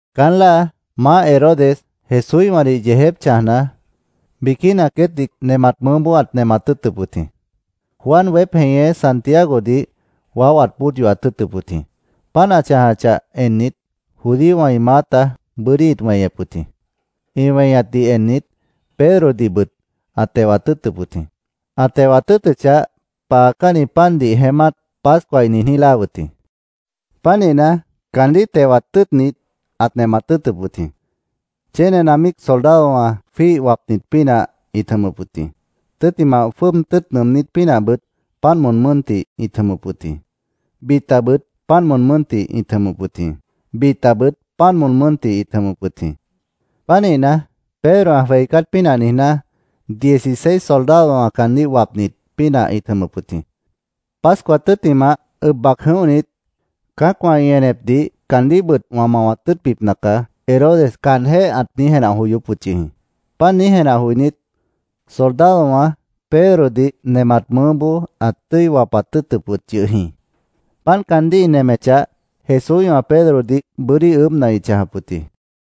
Caán láa Maáh Herodes Jesúíhwãdih yeejép chãjna, biquína queétdih nemat mʉʉ́boó ãt nemat tʉ́ʉtʉp wʉt jĩ. Juan weép jeñé Santiagodih waó ãt bóod yohat tʉ́ʉtʉp wʉt jĩ. Páant ã chãjachah ennit, judíowã ĩ maáta bʉ́dí ĩt weñep wʉt jĩ. Ĩ weñatdih ennit, Pedrodihbʉt ãt tewat tʉ́ʉtʉp wʉt jĩ. Ã tewat tʉ́ʉtʉchah, paacánni pandih jeémát, Pascua ĩ niijní, láa wʉt jĩ. Pánihna, caandíh tewat tʉ́ʉtnit, ãt nemat tʉ́ʉtʉp wʉt jĩ. Chénena míic soldadowã jwíih wapnit pínah ĩt jʉmʉp wʉt jĩ. Tʉ́ttimah, jwʉ́ʉb tʉ́ʉt nʉʉmnít pínahbʉt páant moon mʉ́ntih ĩt jʉmʉp wʉt jĩ. Bitabʉt páant moon mʉ́ntih ĩt jʉmʉp wʉt jĩ. Bitabʉt páant moon mʉ́ntih ĩt jʉmʉp wʉt jĩ. Pánihna, Pedro ã jweicát pínah niijná, dieciseis soldadowã caandíh wapnit pínah ĩt jʉmʉp wʉt jĩ. “Pascua tʉ́ttimah, ʉb bac jʉ̃óhnit, cã́acwã ĩ enepdih caandíhbʉt wã mawat tʉ́ʉtbipna caá”, Herodes caanjéh ãt niíj jenah joyóp wʉt yʉh jĩ. Páant niíj jenah joinít, soldadowã Pedrodih nemat mʉʉ́boó ãt tʉ́i wapat tʉ́ʉtʉp wʉt yʉh jĩ. Páant caandíh ĩ nemechah, Jesúíhwã Pedrodih bʉ́dí ʉʉ́bhna ĩt chãjap wʉt jĩ.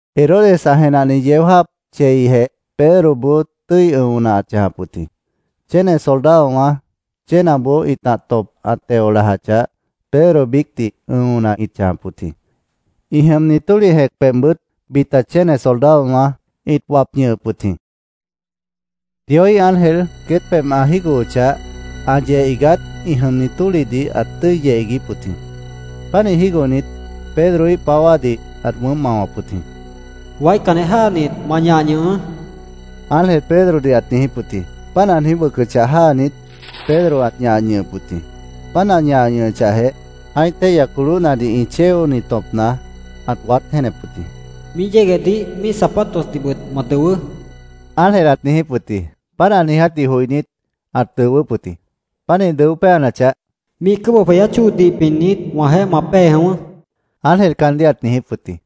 Herodes ã jenahni yeó jáap cheijeh Pedroboó tʉ́i ʉ̃ona ãt chãjap wʉt jĩ. Chéne soldadowã chénaboó ĩtah tõp ã teo lajachah, Pedro biícdih ʉ̃ona ĩt chãjap wʉt jĩ. Ĩ jʉmni tólih jẽc pebhbʉt bita chéne soldadowã ĩt wap ñʉhʉp wʉt jĩ. Dioíh ángel queét pebh ã jígohochah, ã yeh iigát ĩ jʉmni tólihdih ãt tʉ́i yeh iiguíp wʉt jĩ. Pánih jígohnit, Pedroíh páwádih ãt wʉʉ́mp mao wʉcʉp wʉt jĩ. “¡Waícanjeh jáanit, ma ñah ñʉhʉʉ́!” ángel Pedrodih ãt niijíp wʉt jĩ. Páant ã niíj wʉcʉchah jáanit, Pedro ãt ñah ñʉhʉp wʉt jĩ. Páant ã ñah ñʉhʉchahjeh, ã́ih téihya colóhnadih ĩ chéoni tõpna ãt waát jéenep wʉt jĩ. “Míih yéguehdih míih zapatosdihbʉt ma dʉwʉʉ́”, ángel ãt niijíp wʉt jĩ. Páant ã niiját joinít, ãt dʉwʉ́p wʉt jĩ. Pánih dʉó péanachah, “Míih cʉ́bʉh jweyát chóodih pinnit, wãjeéh ma pée jʉ̃ʉ́wʉ́”, ángel caandíh ãt niijíp wʉt jĩ.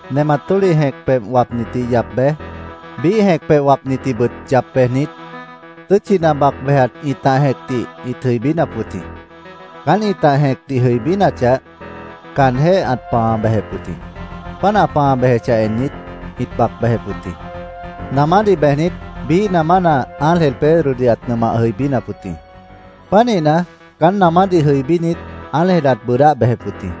Nemat tólih jẽc pebh wapnitdih yap bej, biíh jẽc pebh wapnitdihbʉt yap bejnit, tʉ́tchina bac bejat ĩtah jẽcdih ĩt jʉibínap wʉt jĩ. Caán ĩtah jẽcdih ĩ jʉibínachah, caanjéh ãt pãa bejep wʉt jĩ. Páant ã pãa bejechah ennit, ĩt bac bejep wʉt jĩ. Namádih bejnit, biíh namána ángel Pedrodih ãt nʉmah jʉibínap wʉt jĩ. Pánihna, caán namádih jʉibínit, ángel ãt bʉʉdáh bejep wʉt jĩ.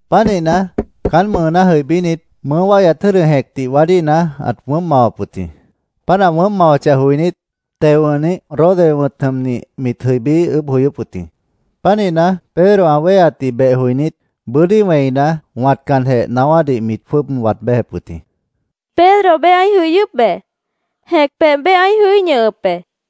Pánihna, caán mʉʉná jʉibínit, mʉʉ́ wáihyat jʉ́dʉ jẽcdih waádíhna, ãt wʉʉ́mp mawap wʉt jĩ. Páant ã wʉʉ́mp mawachah joinít, teo wʉ̃hnih Rode wʉ̃t jʉmnih mit jʉibí ʉʉ́bh joyóp wʉt jĩ. Pánihna, Pedro ã wéheatdih beh joinít, bʉ́dí wẽina, wãtcanjeh, naáwádih mit jwʉ́ʉb waad béjep wʉt jĩ. —Pedro beé ãí jʉyʉ́p be. Jẽc pebh ãí ñʉhʉp be, mit niijíp wʉt jĩ.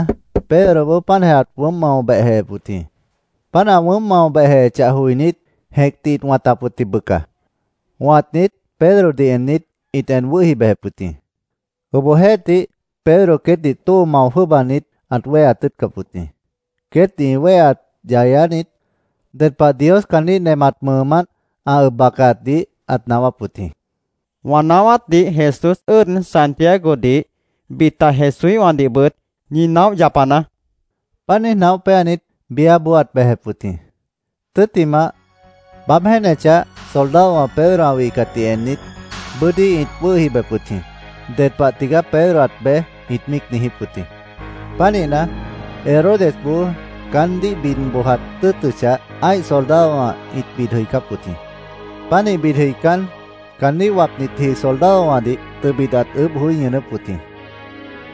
Pánihna, Pedroboó páantjeh ãt wʉʉ́mp mao behjehep wʉt jĩ. Páant ã wʉʉ́mp mao behjehechah joinít, jẽcdih ĩt wãtap wʉt jĩ, bʉca. Wãtnit, Pedrodih ennit, ĩt en wʉ́hi bejep wʉt jĩ. Obohjeéhtih, Pedro queétdih tóo mao jwʉ́ʉbanit, ãt wéheat tʉ́ʉtcap wʉt jĩ. Queétdih ĩ wéheat yayánit, ded pah Dios caandíh nemat mʉʉmánt ã ʉb bacaatdih ãt naáwáp wʉt jĩ. —Wã naáwátdih Jesús ʉ́ʉd Santiagodih, bita Jesúíhwãdihbʉt ñi naóh yapanaá, ãt niijíp wʉt jĩ. Páant niíj naóh péanit, biáboó ãt bejep wʉt jĩ. Tʉ́ttimah, baáb jéenechah, soldadowã Pedro ã wihcatdih ennit, bʉ́dí ĩt wʉ́hi bejep wʉt jĩ. “¿Ded pah tigaá Pedro ãt bej?” ĩt míic niijíp wʉt jĩ. Pánihna, Herodesboó caandíh bid bojat tʉ́ʉtʉchah, ã́ih soldadowã ĩt bid jʉicáp wʉt jĩ. Pánih bid jʉicán, caandíh wapnitji soldadowãdih tʉbit ãt ʉʉ́bh joí ñʉʉnʉ́p wʉt jĩ.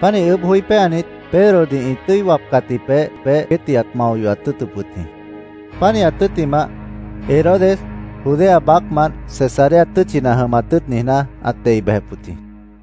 Pánih ʉʉ́bh joí péanit, Pedrodih ĩ tʉ́i wapcatji peéh, queétdih ãt mao yohat tʉ́ʉtʉp wʉt jĩ. Pánihat tʉ́ttimah, Herodes Judea baácmant Cesarea tʉ́tchina jʉmat tʉ́ʉt niijná, ãt dei bejep wʉt jĩ.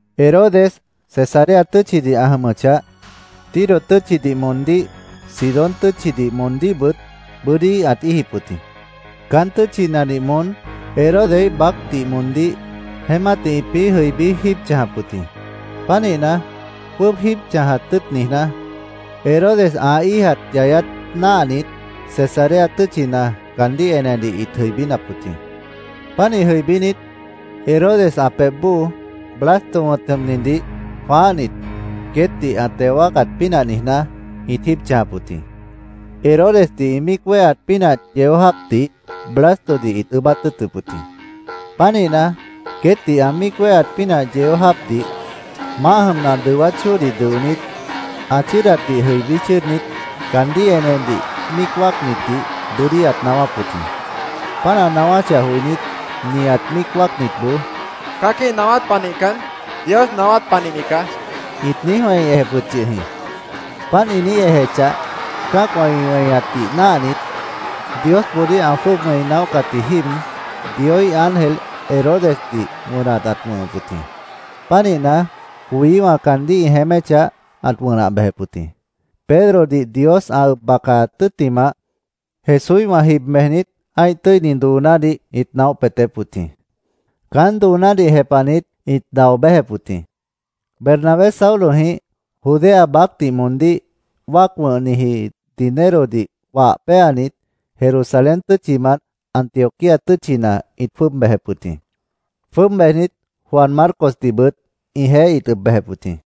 Herodes Cesarea tʉ́tchidih ã jʉmʉchah, Tiro tʉ́tchidih moondíh, Sidón tʉ́tchidih moondíhbʉt bʉ́dí ãt íijip wʉt jĩ. Caán tʉ́tchinadih moón Herodeíh baácdih moondíh jeémátdih ĩpĩ́ jʉibí jíib chãjap wʉt jĩ. Pánihna, jwʉ́ʉb jíib chãjat tʉ́ʉt niijná, Herodes ã íijat yayát náahnit, Cesarea tʉ́tchina caandíh enedih ĩt jʉibínap wʉt jĩ. Pánih jʉibínit, Herodes ã pebh bóo Blasto wʉ̃t jʉmnidih jwãáhnit, queétdih ã teo wáacat pínah niijná, ĩt jíib chãjap wʉt jĩ. Herodesdih ĩ míic wéheat pínah yeó jáapdih Blastodih ĩt ʉʉ́bát tʉ́ʉtʉp wʉt jĩ. Pánihna, queétdih ã míic wéheat pínah yeó jáapdih, maáh jʉmna ã dʉwát chóodih dʉonít, ã chʉ́ʉdatdih jʉibí chʉ́ʉdnit, caandíh enedih míic wáacnitdih bʉ́dí ãt naáwáp wʉt jĩ. Páant ã naáwáchah joinít, nihat míic wáacnitboó “Cã́aquíh naáwát panihcan, Dios naáwát panihni caá”, ĩt niíj wẽi ejep wʉt yʉh jĩ. Páant ĩ niíj ejechahjeh, cã́acwã ĩ weñatdih náahnit, Diosboodíh ã jwʉ́ʉb wẽi naóhcatji jíib, Dioíh ángel Herodesdih wʉnat ãt wʉ̃hʉp wʉt jĩ. Pánihna, coyíwã caandíh ĩ jeéméchah, ãt wʉnah bejep wʉt jĩ. Pedrodih Dios ã ʉb bacaat tʉ́ttimah, Jesúíhwã jib bejnit, ã́ih tʉ́ini doonádih ĩt naóh peetép wʉt jĩ. Caán doonádih jepahnit ĩt dao béjep wʉt jĩ. Bernabé Saulojĩh Judea baácdih moondíh wáac wʉ̃hniji dinerodih wah péanit, Jerusalén tʉ́tchimant Antioquía tʉ́tchina ĩt jwʉ́ʉb bejep wʉt jĩ. Jwʉ́ʉb bejnit, Juan Marcosdihbʉt ĩjeéh ĩt ʉb bejep wʉt jĩ.